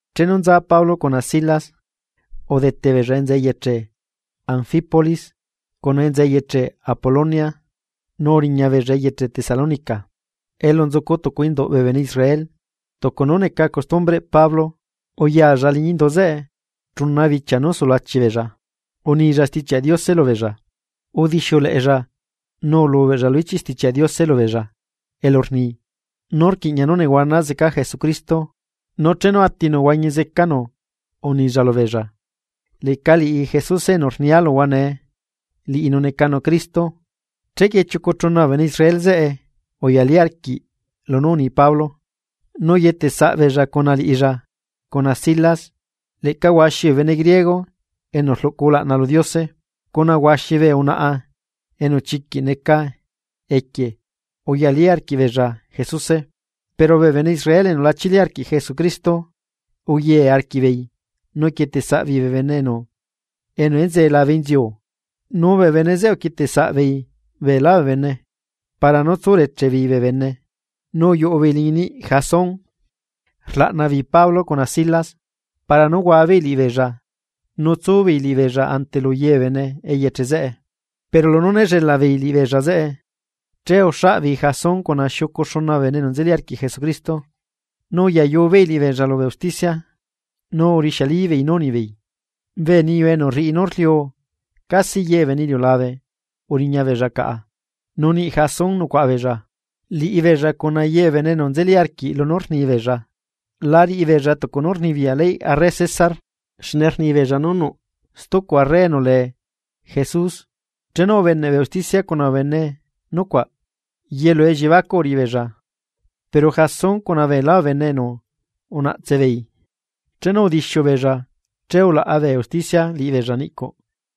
Chenu nza Pablo cuna Silas, udete beella enza eyeche Anfípolis cuna enza eyeche Apolonia nu uriñabeella eyeche Tesalónica, elu nzucu tucu induꞌ bee bene Israel. Tucu nú neca costumbreꞌ Pablo, uyalla liñi indu zeꞌe chuna bichia nú sulachi beella, unilla Stichiaꞌ Diose lubeella. Udixiuleꞌella nu ulubeꞌlla lu ichiꞌ Stichiaꞌ Diose lubeella elu rni nú rquiꞌña nú nehuana zeca Jesucristo, nu chenu atinu huañi zecanu unilla lubeella: ―Leꞌca liꞌi Jesuse enu rnia luhua nee, liꞌinu necanu Cristo. Chequie chiucu chuna bee bene Israel zeꞌe uyalí arquiꞌ lunú uni Pablo, nu uyetesaꞌbeella cuna liꞌilla cuna Silas, leꞌca huaxi bee bene griego enu rluꞌcu ulaꞌna lu Diose cuna huaxi bee unaꞌa enu chiquiꞌ neca equie uyalí arquiꞌbeella Jesuse. Pero bee bene Israel enu la chili arquiꞌ Jesucristo, uye arquiꞌbeei nu uquieteꞌsaꞌbeei bee bene enu enzee labe inziu, nu bee bene zeꞌe uquieteꞌsaꞌbeei beelá bee bene para nú tsureche beei bee bene. Nu uyuꞌu beei liñi niꞌ Jasón rlaꞌna beei Pablo cuna Silas para nú huabeei liꞌibeella nu tsu beei liꞌibeella ante lu ye bee bene eyeche zeꞌe. Pero lunú néllelaꞌ beei liꞌibeella zeꞌe, che uxaꞌbeei Jasón cuna xiucu xuna bee bene enu nzeli arquiꞌ Jesucristo, nu uyayu beei liꞌibeella lubee usticia, nu urixialibeei nú unibeei: ―Bee niyu enu rriꞌi nú rliu casi ye bee bene iliulabe uriñabeella caꞌa, nu niꞌ Jasón nucuaꞌa beella. Liꞌibeella cuna ye bee bene enu nzeli arquiꞌ lunú rnibeella, la riꞌi beella tucu nú rnibiyaꞌ leyꞌ arre César. Xne rnibeella nú nuꞌ stucu arre enu lee Jesús. Chenu ubeneꞌ bee usticia cuna bee bene nucuaꞌ, yelu elliebacuꞌ uriꞌi beella. Pero Jasón cuna beelá bee bene enu unaꞌtse beei, chenu udixiu beella che ulaꞌa bee usticia liꞌibeella niꞌcuꞌ.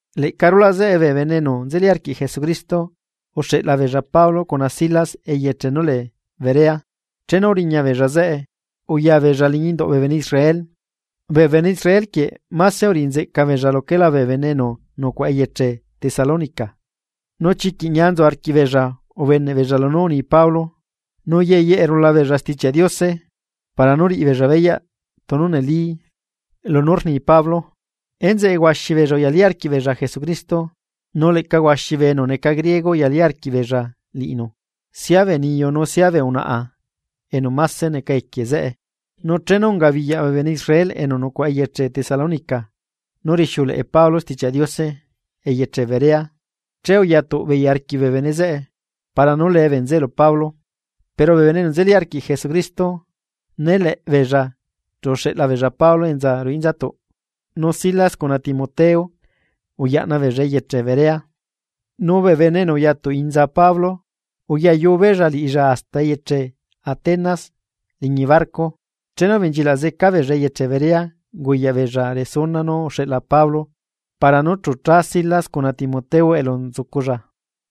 Leꞌca rulaꞌ zeꞌe, bee bene enu nzeli arquiꞌ Jesucristo uxeꞌla beella Pablo cuna Silas eyeche nú lee Berea. Chenu uriñabeella zeꞌe, uya beella liñi induꞌ bee bene Israel. Bee bene Israel quieꞌ máse uriꞌi nzeꞌca beella luquela bee bene enu nucuaꞌa eyeche Tesalónica, nu chiquiꞌ ñia nzu arquiꞌbeella ubeneꞌbeella lunú uni Pablo, nu yeyeꞌe rula beella sitichiaꞌ Diose para nú riꞌi beella beyaꞌ tunu neli lunú rni Pablo. Enzeꞌe huaxi beella uyalí arquiꞌbeella Jesucristo, nu leꞌca huaxi bee enu neca griego uyalí arquiꞌbeella liꞌinu, sia bee niyu nu sia bee unaꞌa enu máse neca equie zeꞌe. Nu chenu ungabiyaꞌ bee bene Israel enu nucuaꞌa eyeche Tesalónica nú rixiuleꞌe Pablo Stichiaꞌ Diose eyeche Berea, che uyatuꞌ beei arquiꞌ bee bene zeꞌe para nú lee bee bene zeꞌe lu Pablo. Pero bee bene enu nzeli arquiꞌ Jesucristo né leꞌbeella chu uxeꞌla beella Pablo enza ruꞌu inzatuꞌ. Nu Silas cuna Timoteo uyaꞌna beella eyeche Berea. Nu bee bene enu uya tuꞌinza Pablo uyayu beella liꞌilla hasta eyeche Atenas liñi barco chenu ubenchilaꞌ zeca beella eyeche Berea unguyaꞌbeella resuna nú uxeꞌla Pablo para nú chu cha Silas cuna Timoteo elu nzuculla.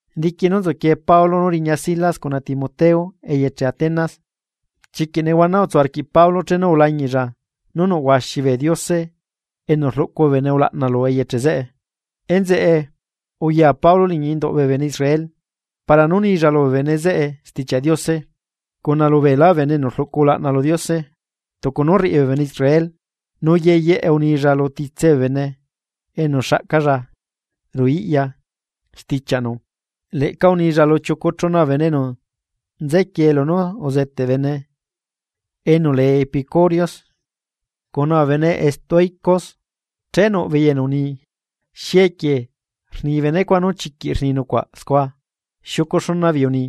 Diqui nú nzuquie Pablo nú riña Silas cuna Timoteo eyeche Atenas, chiquiꞌ nehuana utsu arquiꞌ Pablo chenu ulañiꞌlla nú nuꞌ huaxi bee diose enu rluꞌcu bee bene ulaꞌna lu eyeche zeꞌe. Enzeꞌe, uya Pablo liñi induꞌ bee bene Israel para nú unilla lubee bene zeꞌe Stichiaꞌ Diose, cuna lubeelá bee bene enu rluꞌcu ulaꞌna lu Diose tucu nú rriꞌi bee bene Israel, nu yeyeꞌe unilla lu titse bee bene enu xaꞌcalla ruꞌu iꞌya stichiaꞌnu. Leꞌca unilla lu chiucu chuna bee bene enu nzequiee lunú uzeteꞌ bene enu lee epicúreos, cuna bee bene estoicos, che nuꞌbeei enu uni: ―¿Xi equie rni benecuaꞌ nú chiquiꞌ rni nucuaꞌ scua? Xiucu xuna beei uni: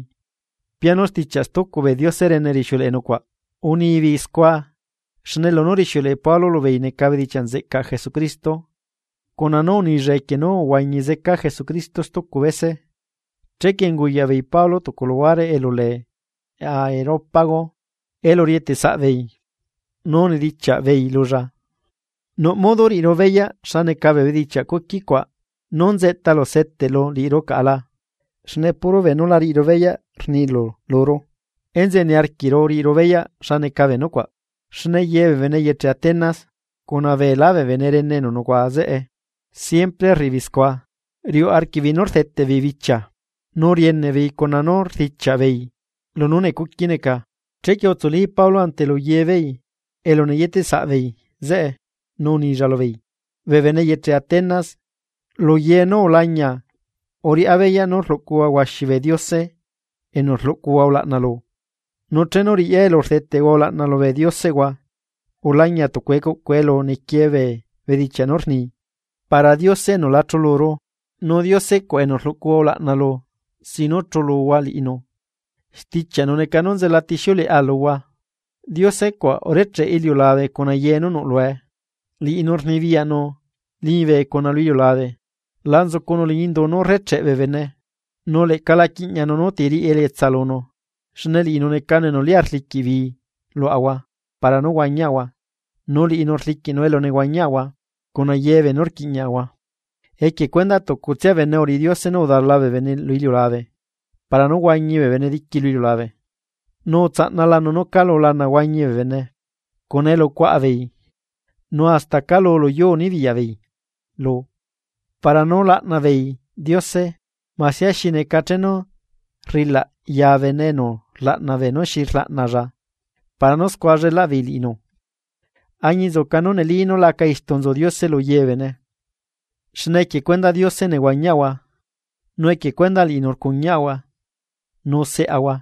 ―Pianu stichiaꞌ stucu bee diose rene rixiuleꞌe nucuaꞌ unibeei. Unibeei scua xne lunú rixiuleꞌe Pablo lubeei neca bedichiaꞌ nzeꞌcaꞌ Jesucristo, cuna nú unilla equie nú uhuañi zeca Jesucristo stucu bese. Chequie unguyaꞌbeei Pablo tucu luhuare elu lee Areópago elu rieteꞌsaꞌbeei. Nu unidichiaꞌ beei lulla: ―¿Nuꞌ modo riꞌiru beyaꞌ xa neca bee bedichiaꞌ cuqui cuaꞌ nú nzeꞌtalu seteꞌlu liꞌiru caꞌa la? Xne puro beenú la riꞌiru beyaꞌ rnilu luru, enzeꞌe niarquiꞌru riꞌiru beyaꞌ xa neca bee nucuaꞌ. Xne ye bee bene eyeche Atenas, cuna beelá bee bene rene enu nucuaꞌa zeꞌe, siempre rriꞌibeei scua, riuꞌ arquiꞌbeei nú rdeteꞌ beei bichia nú rieneꞌ beei cuna nú rdichiaꞌ beei lunú necuqui neca. Chequie utsuli Pablo ante lu ye beei elu neyeteꞌsaꞌ beei zeꞌe, nu unilla lubeei: ―Bee bene eyeche Atenas, lu ye nú ulañia uriꞌá beyaꞌ nú rluꞌcuhua huaxi bee diose enu rluꞌcuhua ulaꞌna lu. Nu chenu riꞌya elu rdeteꞌhua ulaꞌna lubee dioseꞌhua, ulañia tucu ecuꞌcu elu niquie bee bedichiaꞌ nú rni: “Para Diose enu la chuluru.” Nu Diose cuaꞌ enu rluꞌcuhua ulaꞌna lu sin nú chuluhua liꞌinu, stichiaꞌnu neca nú nzelatixiuleꞌa luhua. ’Diose cuaꞌ urecheꞌe iliulabe cuna ye nú nuꞌ lue, liꞌinu rnibiyaꞌnu liñibe cuna lu iliulabe. La nzucunu liñi indu nú rrecheꞌ bee bene, nu leꞌca la quiꞌñanu núti riꞌi elietsa lunu, xne liꞌinu necanu enu lia rliquiꞌ bii luaꞌahua para nú huañiaꞌahua nu liꞌinu rliquiꞌnu elu nehuañiaꞌahua, cuna ye beenú rquiꞌñiaꞌahua. ’Equie cuendaꞌ tucutsia bene uriꞌi Diose nú udala bee bene lu iliulabe para nú huañi bee bene diqui lu iliulabe, nu utsaꞌnalanu nú calu lana huañi beei, cuna elu cuaꞌa beei nu hasta calu luyuu nibiyaꞌ beei lu. Para nú laꞌna beei Diose masia xi neca chenu rrilaꞌ ya bene nú rlaꞌna bene xi rlaꞌnalla para nú scua llelaꞌ beei liꞌinu. Añinzuca nú neli nú laca istu nzu Diose lu ye bee bene. Xne equie cuendaꞌ Diose nehuañiaꞌahua, nu equie cuendaꞌ liꞌinu rcuñiaꞌahua nu seꞌahua,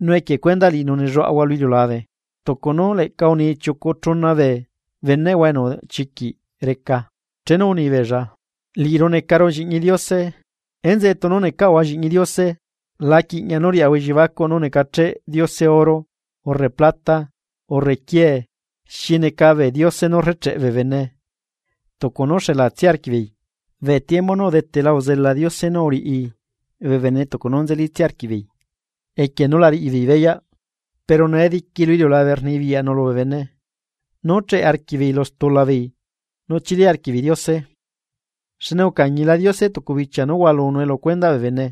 nu equie cuendaꞌ liꞌinu nelluaꞌahua lu iliulabe. Tucu nú leꞌca uni chiucu chuna bee beneꞌhua enu chiquiꞌ reca chenu unibeella: “Liꞌiru necaru lliꞌñi Diose.” Enzeꞌe tunu necaꞌahua lliꞌñi Diose, la quiꞌña nú riaꞌahua elliebacuꞌ nú necacheꞌ Diose oro urre plata urre quiee, xi neca bee diose nú rrecheꞌe bee bene tucu nú xelatsia arquiꞌbeei. Bee tiembu nú udetela uzela Diose nú uriꞌi bee bene tucu nú nzelitsia arquiꞌbeei equie nú la riꞌi beei beyaꞌ, pero nee diqui lu iliulabe rnibiyaꞌnu lubee bene, nú cheꞌe arquiꞌbeei lu stula beei nu chili arquiꞌbeei Diose. Xne ucañila Diose tucu bichia nú hualunue lu cuendaꞌ bee bene.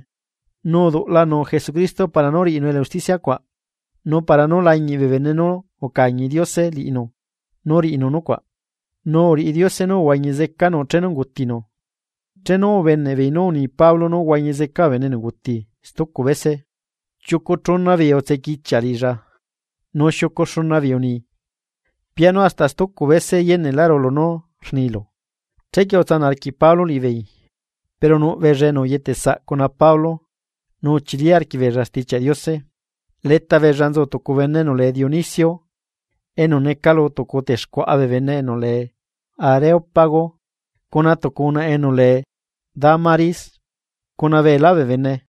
Nu uduꞌlanu Jesucristo para nú riꞌinu elu usticia cuaꞌ, nu para nú lañiꞌ bee bene nú ucañi Diose liꞌinu nú riꞌinu nucuaꞌ, nu uriꞌi Diose nú uhuañi zecanu chenu ungutinu. Chenu ubeneꞌbeei nú uni Pablo nú huañi zeca bee benenguti stucu bese, chiucu chuna beei utsequichiaꞌ liꞌilla, nu xiucu xuna beei uni: ―Pianu hasta stucu bese yeneꞌlaꞌru lunú rnilu. Chequie utsanaꞌ arquiꞌ Pablo liꞌibeei, pero nuꞌ beella enu uyetesaꞌ cuna Pablo nu uchili arquiꞌbeella Stichiaꞌ Diose. Leta beella nzu tucu bene enu lee Dionisio, enu neca lu tucu texcuaꞌa bee bene enu lee Areópago, cuna tucu unaꞌa enu lee Dámaris, cuna beelá bee bene.